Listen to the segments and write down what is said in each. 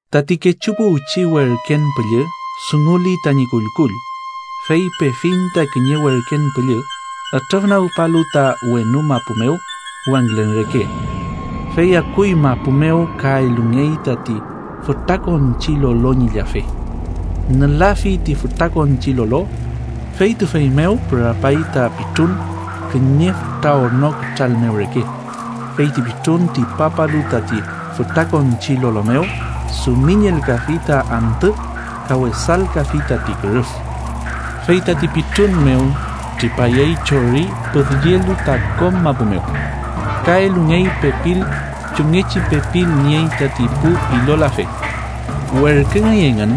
Tati kechu puwchi werken püllü dunguli tañi kullkull, fey pefiñ ta kiñe werken püllü ütrüfnagpalu ta wenu mapu mew wangülen reke, fey akuy mapu mew ka elungey tati fütrakonchi lolo ñi llafe. Nülafi ti fütrakonchi lolo, fey tüfey mew pürapay ta pitrun kiñe fütra orno kütral mew reke. Fey ti pitrun tripapalu tati fütrakonchi lolo mew dumiñelkafi ta antü ka wesalkafi tati kürüf. Fey tati pitrun mew tripayey chori püdyelu ta kom mapu mew, ka elungey pepil chumngechi pepil niey tati pu ilolafe. Werküngey engün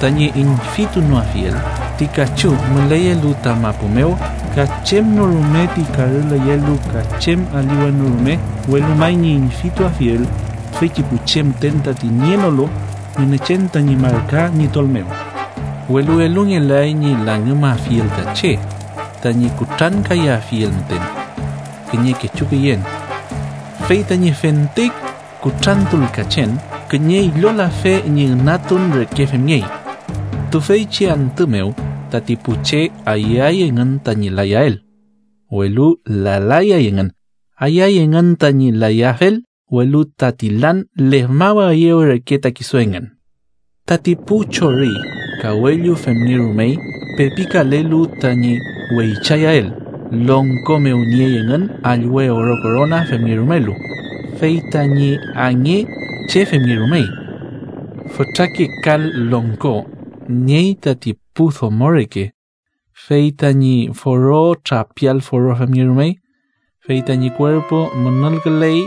tañi üñfitunoafiel ti kachu müleyelu ta mapu mew ka chem no rume ti karüleyelu ka chem aliwen no rume, welu may ñi üñfituafiel tüfeychi pu che müten tati nienolu Ngünechen tañi marka ñi tol mew. Welu elungelay ñi langümafiel ta che, tañi kutrankayafiel müten kiñe kechu küyen, fey tañi fente kutrantulkachen kiñe ilolafe ñi ünatun reke femngey. Tüfeychi antü mew tati pu che ayüay engün tañi layael, welu lalayay engün. Ayüay engün tañi layafel, welu tati lan lefmawaeyew reke ta kisu engün. Tati pu chori kawellu femngerumey pepikalelu tañi weychayael. Longko mew niey engün allwe oro korona femngerumelu, fey tañi ange che femngerumey. Fütrake kal longko niey tati pu domo reke, fey tañi foro trapial foro femngerumey. Fey tañi kuerpu munulküley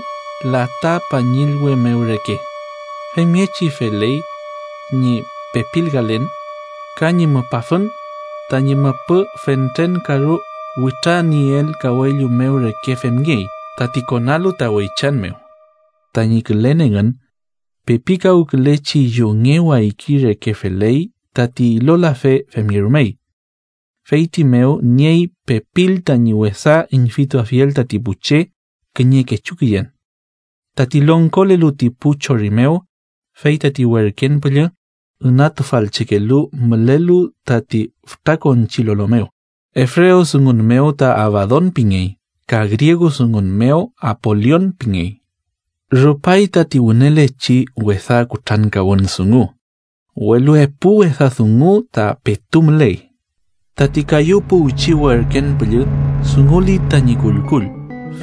lata pañillwe mew reke, femngechi feley ñi pepilkalen, ka ñi mupafün tañi müpü fentren karu witranieel kawellu mew reke femngey, tati konalu ta weychan mew. Tañi külen engün pepikawkülechi yunge wayki reke feley tati ilolafe femngerumey; feyti mew niey pepil tañi wesa üñfituafiel tati pu che kiñe kechu küyen. Tati longkolelu ti pu chori mew, fey tati werken püllü ünatufalchekelu mülelu tati fütrakonchi lolo mew, ebrewdungun mew ta Abadon pingey ka griegudungun mew Apolion pingey. Rupay tati wünelechi wesa kutrankawün dungu, welu epu wesa dungu ta petu müley. Tati kayu puwchi werken püllü dunguli tañi kullkull,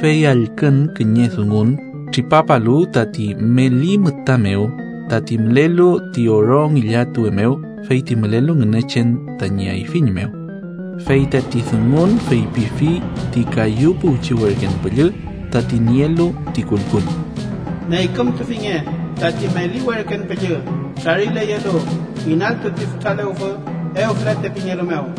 fey allkün kiñe dungun tripapalu tati meli müta mew tati mülelu ti oro ngillatuwe mew feyti mülelu Ngünechen tañi ayfiñ mew. Fey tati dungun feypifi ti kayu puwchi werken püllü, tati nielu ti kullkull: “Neykümtufinge tati meli werken püllü trarileyelu inaltu ti fütra lewfü Ewfrate pingelu mew.”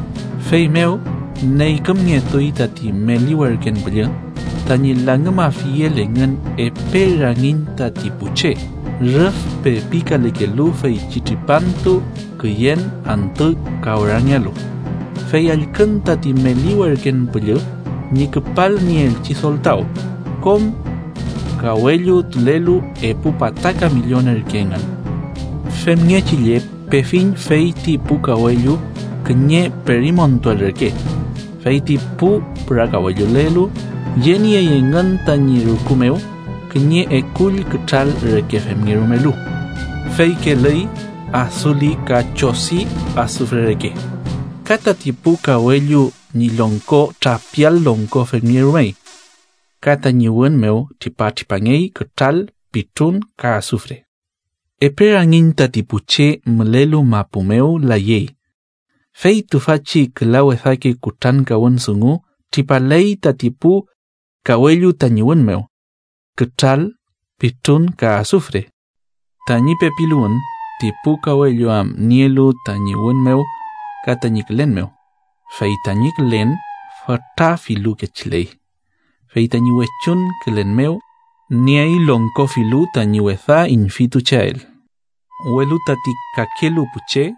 Feymew neykümngetuy tati meli werken püllü, tañi langümafiel engün epe rangiñ tati pu che, rüf pepikalekelu feychi tripantu, küyen, antü ka orangealu. Fey allkün tati meli werken püllü ñi küpalnieelchi soltaw, kom kawellutulelu, epu pataka millon ürke engün. Femngechi lle pefiñ feyti pu kawellu kiñe perimontuel reke. Fey ti pu pürakawellulelu yeniey engün tañi rüku mew kiñe ekull kütral reke femngerumelu, fey kelüy, asuli ka chodi asufre reke. Ka tati pu kawellu ñi longko trapial longko femngerumey, ka tañi wün mew tripatripangey kütral, pitrun ka asufre. Epe rangiñ tati pu che mülelu mapu mew layey, fey tüfachi küla wesake kutrankawün dungu tripaley tati pu kawellu tañi wün mew: kütral, pitrun ka asufre. Tañi pepiluwün ti pu kawellu am nielu tañi wün mew ka tañi külen mew. Fey tañi külen fütra filu kechiley, fey tañi wechuñ külen mew niey longko filu tañi wesa üñfitucheael. Welu tati kalelu pu che,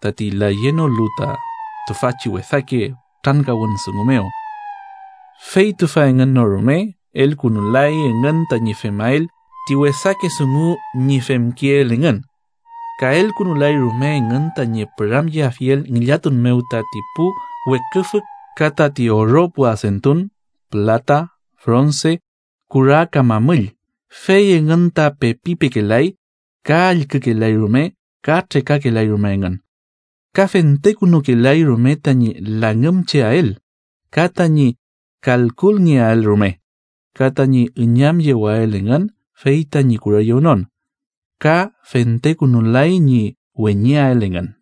tati layenolu ta tüfachi wesake kutrankawün dungu mew, fey tüfa engün no rume elkünulay engün tañi femael ti wesake dungu ñi femkeel engün, ka elkünulay rume engün tañi püramyeafiel ngillatun mew tati pu weküfü ka tati oro pu adentun, pülata, fronse, kura ka mamüll, fey engün ta pepi pekelay ka allkükelay rume ka trekakelay rume engün. Ka fentekünulay rume tañi langümcheael, ka tañi kalkungeael rume, ka tañi üñamyewael engün fey tañi kureyewnon, ka fentekünulay ñi weñeael engün.